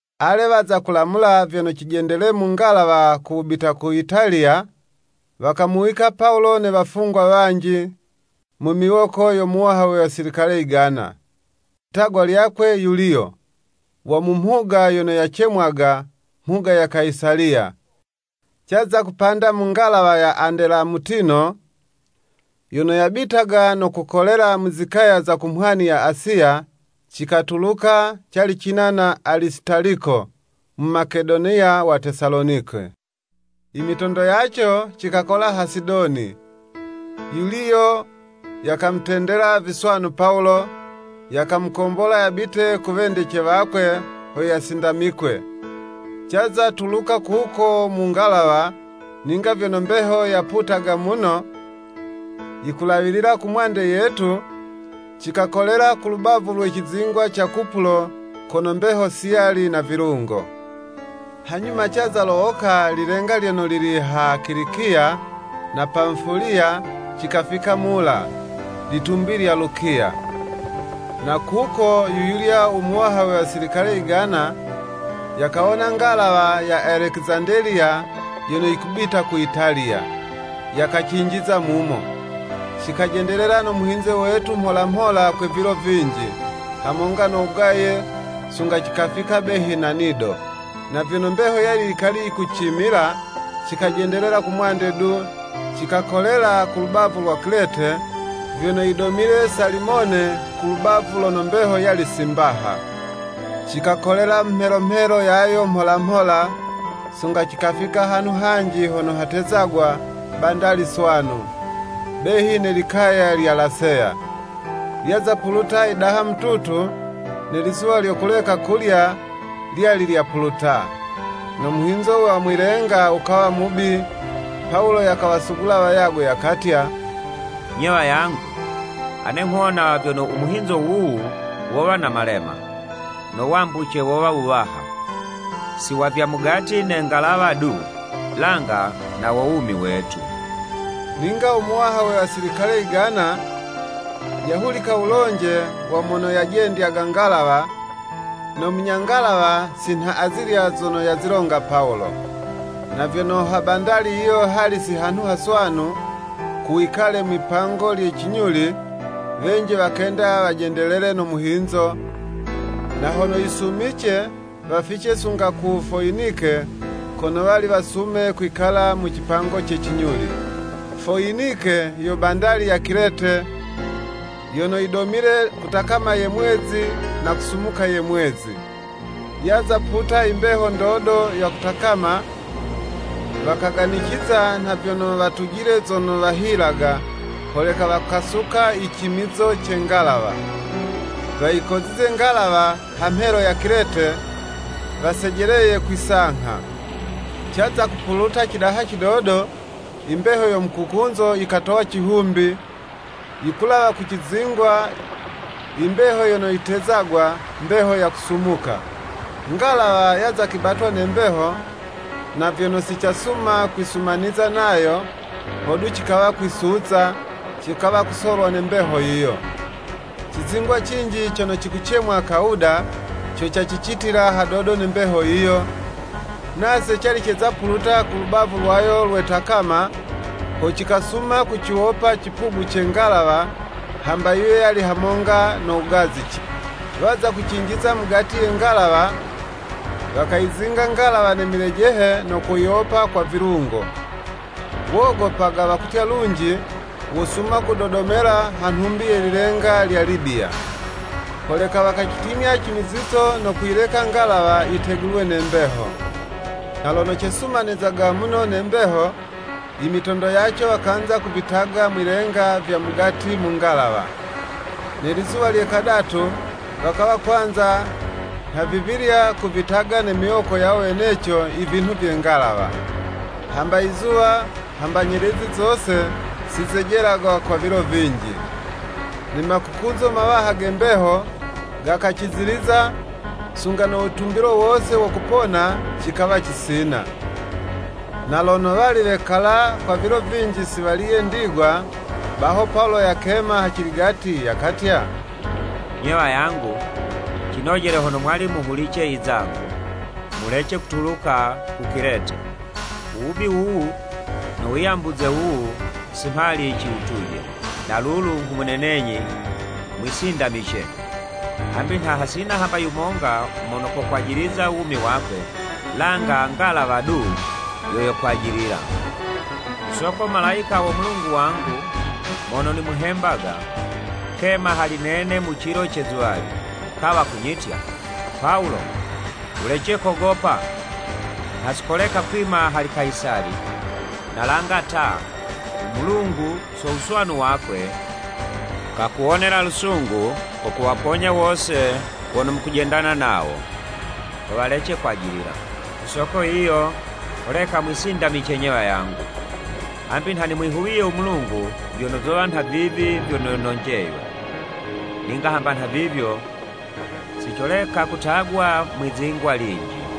Ale waza kulamula vyono cijendele mu ngalawa ku wubita ku Italiya, wakamuwika Pawulo ne wafungwa wanji, mu miwoko yo muwaha we wasilikale yigana, litagwa lyakwe Yuliyo, wa mu mhuga yono yacemwaga, “Mhuga ya Kayisaliya.” Caza kupanda mu ngalawa ya Andelamutino, yono yabitaga no kukolela mu zikaya za ku mhwani za Asiya, cikatuluka, cali cina na Alisitaliko, Mumakedoniya wa Tesalonike. Imitondo yaco cikakola ha Sidoni. Yuliyo yakamutendela viswanu Pawulo, yakamukombola yabite ku wendece wakwe ho yasindamikwe. Caza tuluka kuko mu ngalawa, ninga vyono mbeho yaputaga muno, yikulawilila ku mwande yetu, cikakolela ku lubavu lwe cizingwa ca Kupulo kono mbeho si yali na vilungo. Hanyuma caza lowoka lilenga lyono lili ha Kilikiya na Pamufuliya, cikafika Mula, litumbi lya Lukiya. Na kuko yuyulya u muwaha we wasilikale yigana, yakawona ngalawa ya Alekizandeliya yono yikubita ku Italiya, yakacinjiza mumo. Cikajendelela no muhinzo wetu mholamhola kwa vilo vinji, hamonga no wugaye, sunga cikafika behi na Nido. Na vyono mbeho yali yikali yikucimila, cikajendelela kumwande du, cikakolela kulubavu lwa Kilete, vyono yidomile Salimone ku lubavu lono mbeho yali si mbaha. Cikakolela mu mhelo mhelo yayo mholamhola, sunga cikafika hanhu hanji hono hatezagwa, “Bandali Swanu,” behi ne likaya lya Laseya. Lyaza puluta yidaha mututu, ne lizuwa lyo kuleka kulya lyali lyapuluta. No muhinzo wa mwi'lenga wukawa mubi, Pawulo yakawasugula wayagwe, yakatya, “Nye wayangu, ane nghuwona vyono umuhinzo wuwu wowa na malema, no wambuce wowa wuwaha, si wa vya mugati ne ngalawa du, langa na wo wumi wetu.” Ninga u muwaha we wasilikale yigana, yahulicila wulonje wa mono yayijendyaga ngalawa, no munya ngalawa si nha azilya zono yazilonga Pawulo. Na vyono ha bandali yiyo hali si hanhu haswanu, ku wikale mwi'pango lye cinyuli, wenji wakenda wajendelele no muhinzo, na hono yisumice wafice sunga ku Foyinike kono wali wasume kwikala mu cipango ce cinyuli. Foyinike yo bandali ya Kilete yono yidomile kutakama ye mwezi na kusumuka ye mwezi. Yaza puta imbeho ndodo ya kutakama, wakaganiciza nha vyono watujile zono wahilaga, holeka wakasuka i cimizizo ce ngalawa, wakawa kwelela, wayikozize ngalawa ha mhelo ya Kilete, wasejeleye kwi'sangha. Caza kupuluta cidaha cidodo, imbeho yo mukukunzo yikatowa cihumbi, yikulawa ku cizingwa, imbeho yono yitezagwa, “Mbeho ya kusumuka.” Ngalawa yaza kwibatwa ne mbeho, na vyono si casuma kwisumaniza nayo, hodu cikawa kwisuza, cikawa kusolwa ne mbeho yiyo. Cizingwa cinji cono cikucemwa Kawuda, co cacicitila hadodo ne mbeho yiyo, nase cali ceza puluta ku lubavu lwayo lwe takama, ho cikasuma kuciwopa cipugu ce ngalawa, hamba yiwe yali hamonga no wugazice. Waza kucinjiza mugati ye ngalawa, wakayizinga ngalawa na milejehe no kuyiwopa kwa vilungo. Wogopaga, wakutya lunji wosuma kudodomela ha nhumbi ye lilenga lya Libiya. Holeka wakacitimya cimizizo no kuyileka ngalawa yitegulwe ne mbeho. Na lono cesumanizaga muno ne mbeho, imitondo yaco wakanza kuvitaga mwi'lenga vya mugati mu ngalawa. Ne lizuwa lye kadatu, wakawa kwanza nhavivilya kuvitaga ne miwoko yawo weneco ivinhu vye ngalawa. Hamba izuwa, hamba zinyelezi zose, si zejelaga kwa vilo vinji, ne makukunzo mawaha ge mbeho gakaciziliza, sunga no witumbilo wose wo kupona, cikawa cisina. Na lono wali wekala kwa vilo vinji si waliye ndigwa, baho Pawulo yakema haciligati yakatya, “Nye wayangu, cinojele hono mwali muhulice izangu, mulece kutuluka ku Kilete, u wubi wuwu no wiyambuze wuwu si mhali ciwutuje. Na lulu nghumunenenyi mwisindamice, hambi nha hasina hamba yumonga mono kokwajiliza uwumi wakwe, langa ngalawa du yo yokwajilila. Ku soko Malayika wo Mulungu wangu, mono nimuhembaga, kema hali nene mu cilo ce zuwali, kawa kunyitya, ‘Pawulo, Wulece kogopa, nha si koleka kwima hali Kayisali, na langa ta, u Mulungu so wuswanu wakwe, kakuwonela lusungu ko kuwaponya wose wono mukujendana nawo ho walece kwajilila.’ Ku soko yiyo, holeka mwisindamice 'nye wayangu, hambi nha nimwihuwiye u Mulungu vyono zowa nha vivi vyono nonjeywe. Ninga hamba nhavivyo, si coleka kutagwa mwi'zingwa linji.”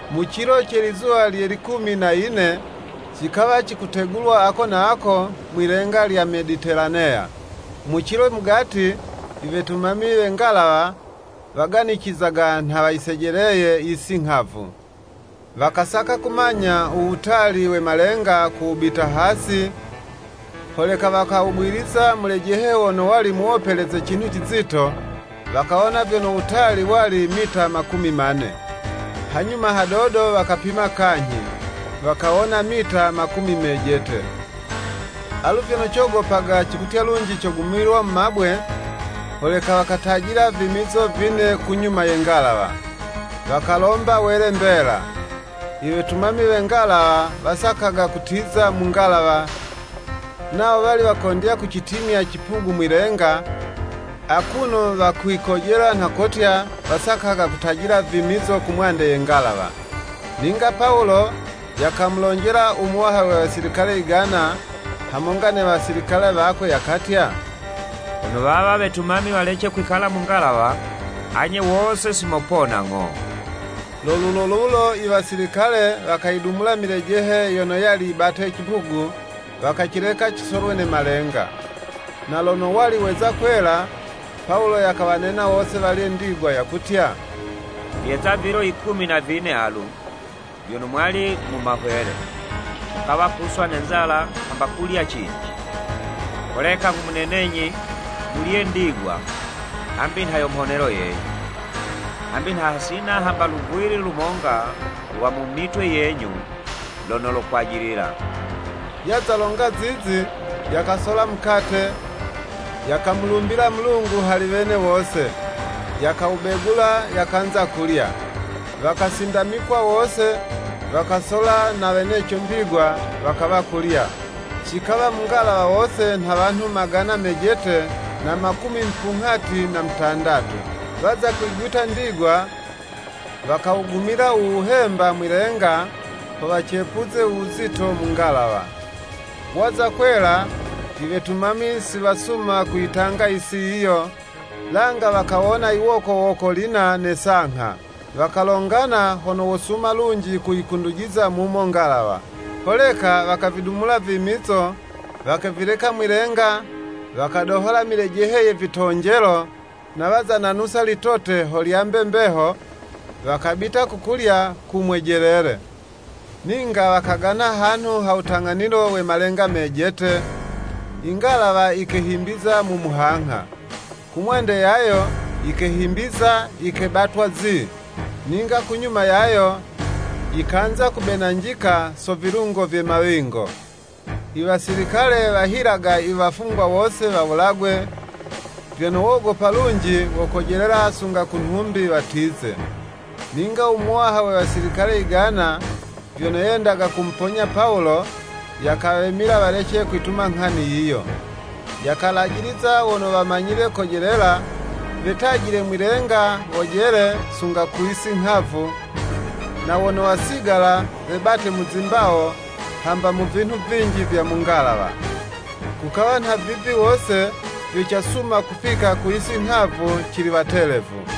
Mu cilo ce lizuwa lye likumi na yine, cikawa cikutegulwa ako na ako mwi'lenga lya Meditelaneya. Mu cilo mugati, iwetumami we ngalawa waganicizaga nha wayisejeleye yisi nghavu. Wakasaka kumanya uwutali we malenga ku wubita hasi, holeka wakawugwiliza mulejehe wono wali muwopeleze cinhu cizito, wakawona vyono wutali wali mita makumi mane. Hanyuma hadodo wakapima kanyhi, wakawona mita makumi mejete. Alu vyono cogopaga cikutya lunji cogumilwa mu mabwe, holeka wakatajila vimizo vine kunyuma ye ngalawa. Wakalomba wele mbela. Iwetumami we ngalawa wasakaga kutiza mu ngalawa, nawo wali wakondya kucitimya cipugu mwi'lenga, akuno wakwikojela nha kotya wasakaga kutajila vimizo kumwande ye ngalawa. Ninga Pawulo yakamulonjela u muwaha we wasilikale yigana, hamonga ne wasilikale wakwe, yakatya, “Hono wawa wetumami walece kwikala mu ngalawa, anye wose si mopona ng'o.” Lo lulo lulo iwasilikale wakayidumula milejehe yono yali yibate cipugu, wakacileka cisolwe ne malenga. Na lono wali weza kwela, Pawulo yakawanena wose walye ndigwa, yakutya, “Vyeza vilo yikumi na vine alu, vyono mwali mu mahwele, mukawa kuswa ne nzala hamba kulya cinji. Holeka nghumunenenyi, mulye ndigwa, hambi nha yo mhonelo yenyu. Hambi nha hasina hamba luvwili lumonga lwa mu mitwe yenyu lono lokwajilila.” Yaza longa zizi, yakasola mukate, yakamulumbila Mulungu hali wene wose, yakawubegula, yakanza kulya. Wakasindamikwa wose, wakasola na weneco ndigwa, wakawa kulya. Cikawa mu ngalawa wose nha wanhu magana mejete na makumi mupunghati na mutandatu. Waza kwiguta ndigwa, wakawugumila uwuhemba mwi'lenga, ho wacepuze uwuzito mu ngalawa. Waza kwela, iwetumami siwasuma kuyitanga yisi yiyo, langa wakawona yiwokowoko lina ne sangha, wakalongana hono wosuma lunji kuyikundujiza mumo ngalawa. Holeka wakavidumula vimizo, wakavileka mwi'lenga, wakadohola milejehe ye vitonjelo, na waza nanusa litote ho lyambe mbeho, wakabita ku kulya ku mwejelele. Ninga wakagana hanhu ha wutang'anilo we malenga mejete, ingalawa yikehimbiza mu muhangha. Kumwande yayo yikehimbiza yikebatwa zii, ninga kunyuma yayo, yikanza kubenanjika so vilungo vye mawingo. Iwasilikale wahilaga iwafungwa wose wawulagwe, vyono wogopa lunji wokojelela sunga kunhumbi watize. Ninga u muwaha we Wasilikale yigana, vyono yendaga kumuponya Pawulo, yakawemila walece kwituma nghani yiyo. Yakalajiliza wono wamanyile kojelela, wetajile mwi'lenga wojele sunga ku yisi nghavu, na wono wasigala webate mu zimbawo, hamba mu vinhu vinji vya mu ngalawa. Kukawa nha vivi wose, vyo casuma kufika ku yisi nghavu cili watelevu.